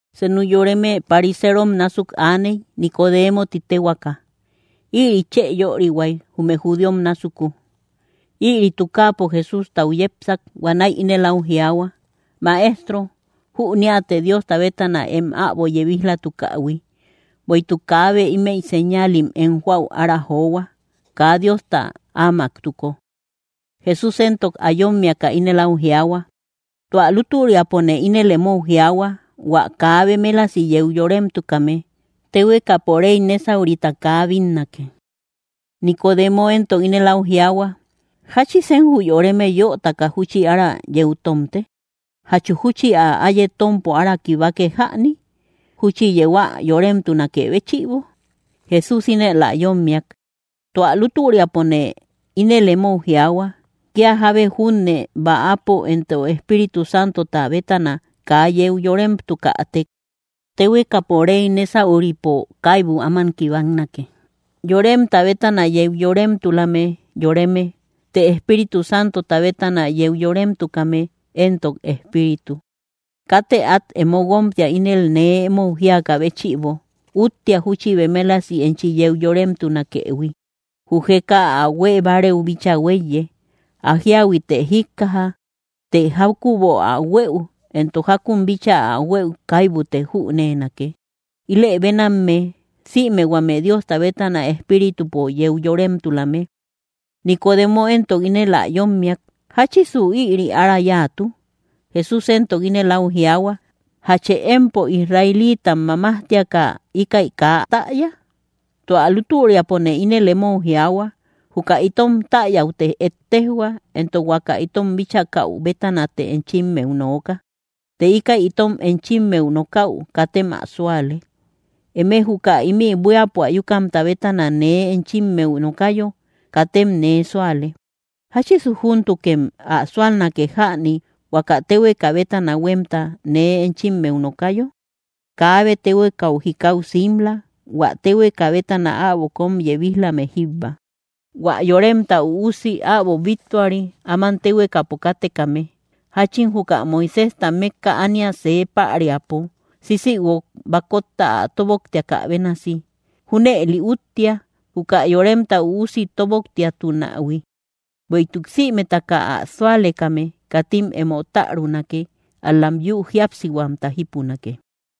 Senu yoreme pariserom násuk aaney, Nicodemo ti téhuaaka. Ïri chë yörihuay, jume judíom násuku. Ïri tukaapo Jesústau yepsak. Huanäi ínel áu jiaahua: —Maestro, jüneate Diosta bétana em äbo yebij‑latukähui; bueïtuk kaabe ímëi señaalim em joäu ára johua, kaa Diosta áamaktuko. Jesús éntok ä yómmiaka ínel áu jiaahua: —Tua lútüriapone ínel emou jiaahua, huä kaa bemélasi yeu yoremtukame, téhuekapo rey nésaurita kaa bínnake. Nicodemo éntok ínel áu jiaahua: —¿Jáchisen jü yoreme yötaka júchi ára yeu tómte? ¿Jachu júchi ä áye tómpo ára kibake jäni? ¿Júchi yeu ä yoremtunakë béchïbo? Jesús ínel ä yómmiak: —Tua lútüriapone ínel emou jiaahua, kía jábe junne bäapo éntok Espíritu Santota bétana kaa yeu yóremtukätek, téhuekapo rey nésauripo kaibu áman kibaknake. Yoremta bétana yeu yoremtulame yoreme; të Espíritu Santota bétana yeu yoremtukame éntok espíritu. Katë át emo guómtia ínel nee emou jíakä béchïbo: “Úttea júchi bemélasi enchi yeu yóremtunakëhui.” Jü jeka ä huée bárëu bíchaa huéiye. Ä jíahuitë jíkkaja. Të jákübo ä huëu, éntok jákun bíchaa ä huëu kaibute jüneenake. Ilë bénamme, sïme huame Diosta bétana Espíritupo yeu yoremtulame. Nicodemo éntok ínel ä yómmiak: —¿Jáchisu ïri ára yáatu? Jesús éntok ínel áu jiaahua: —¿Jachë empo, israelitam mamajtiaka, íkäi kaa täya? Tua lútüriapone ínel emou jiaahua: Juka itom täyäute ettejhua, éntok huaka itom bíchakäu bétanate enchimmeu nooka; të íkäi itom enchimmeu nokäu, katem ä súale. Eme juka ímï buíapo ayukamta bétana nee enchimmeu nokayo, katem nee súale. ¿Jáchisu júntukem ä súalnake jäni, huaka téhueka bétana huémta nee enchimmeu nokayo? ’Kaabe téhuekau jikau simla, hua téhueka bétana äbo kóm yebij‑lame jíbba, hua Yoremta Üusi äbo bittuari, áman téhuekapo kátekame. Jáchin juka Moiséjta mékka ánia see päriapo sisïguok bakotta ä tóboktiakä bénasi, junëli úttea, juka Yoremta Üusi tóboktiatunähui, bueïtuk sïmetaka ä súalekame, katim emo tärunake; ál‑lam yü jíapsihuamta jípunake.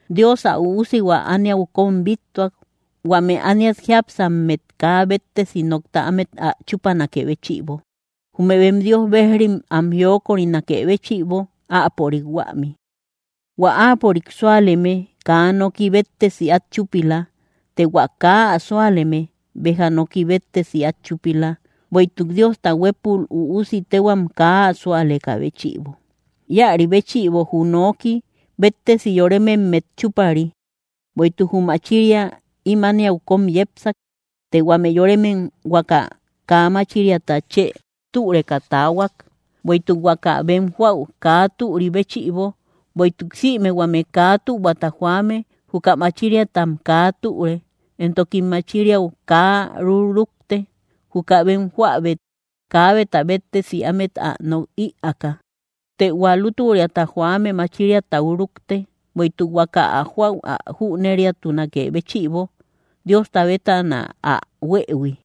Dios ä Üusihua ániau kóm bíttuak, huame ániat jiápsammet kaa béttesi nokta ámet ä chúpanakë béchïbo, jume bem Dios berjim am jiokörinakë béchïbo áapörik huämi. ’Huä áapörik súaleme kaa noki béttesi át chúpila; të hua kaa ä súaleme, béja noki béttesi át chúpila, bueïtuk Diosta huépul Üusi téhuam kaa ä súalekä béchïbo. Íäri béchïbo jü noki béttesi yorememmet chúpari, bueïtuk jü machiria ím ániau kóm yepsak; të huame yoremem huaka kaa máchiraata chë türeka taahuak, bueïtuk huaka bem joäu kaa türi béchïbo. Bueïtuk sïme huame kaa tühuata joame juka machiriatam kaa türe, éntokim machiriau kaa ruk‑rukte, juka bem joäbet kaabeta béttesi ámet ä nok ïaaka. Të hua lútüriata joame machiriatau rúkte, bueïtuk huaka ä joäu ä jüneriatunakë béchïbo, Diosta bétana ä huëhui.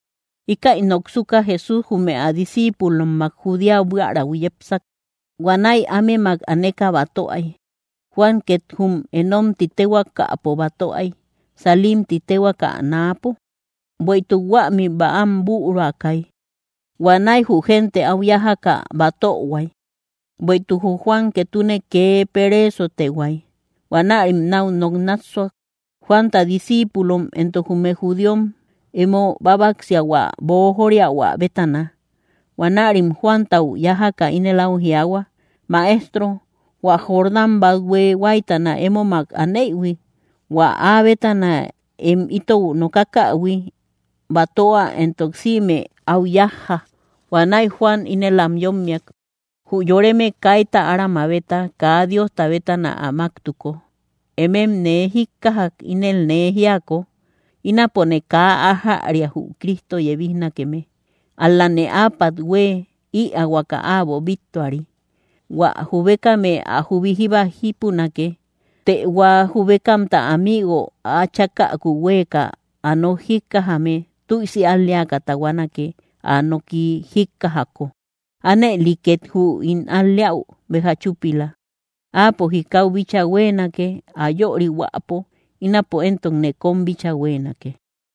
Íkäi noksuka, Jesús jume ä discíipulommak Judea buiärau yepsak. Huanäi ámemak aneka batöay. Juan két jum Enón ti téhuaakapo batöay, Salim ti téhuaakä náapo, bueïtuk huämi bäam büruakay. Huanäi jü génte áu yájaka batöhuay. Bueïtuk jü Juan ketune kee pereesotehuay. Huanärim náu nok nássuak, Juanta discíipulom éntok jume judíom, emo bábaksiahua bojóriahua bétana. Huanärim Juantau yájaka ínel áu jiaahua: —Maestro, hua Jordán bathue huáytana émomak aneïhui, hua áa bétana em itou nokakähui, batöa éntok sïme áu yájja. Huanäi Juan ínel am yómmiak: —Jü yoreme kaita ára mabeta, kaa Diosta bétana ä máktuko. Emem nee jíkkajak ínel nee jíako: Ínapone kaa ájäria jü Cristo yebijnakeme, ál‑lane áapat hue ïaahuaka äbo bíttuari. Huä jubekame ä jubi jíba jípunake, të hua jubekamta amigo ä chákäku huéeka ä nok jíkkajame tüisi al‑leaka tahuanake, ä noki jíkkajako; ánëli két jü ín al‑leäu béja chúpila. Áapo jikau bíchaa huéenake, ä yörihuäpo; ínapo éntokne kóm bíchaa huéenake.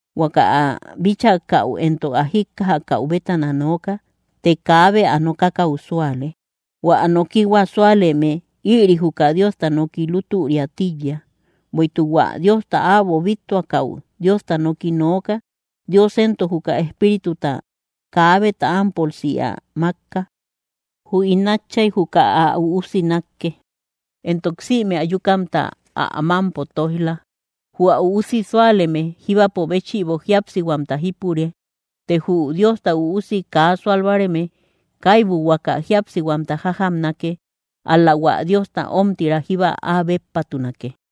Huaka ä bíchakäu éntok ä jíkkajakäu bétana nooka, të kaabe ä nokakäu súale. Huä ä nokihua súaleme, ïri juka Diosta noki lútüria tíiya. Bueïtuk hua Diosta äbo bíttuakäu Diosta noki nooka; Dios éntok juka Espírituta kaabeta ámpolsi ä mákka. Jü ín Átchay juka ä Üusi nákke, éntok sïme ayukamta ä mámpo tóij‑la. Jü ä Üusi súaleme jíbapo béchïbo jíapsihuamta jípure; të jü Diosta Üusi kaa súal báareme kaibu huaka jíapsihuamta jájamnake, ál‑la hua Diosta ómtira jíba áa béppatunake.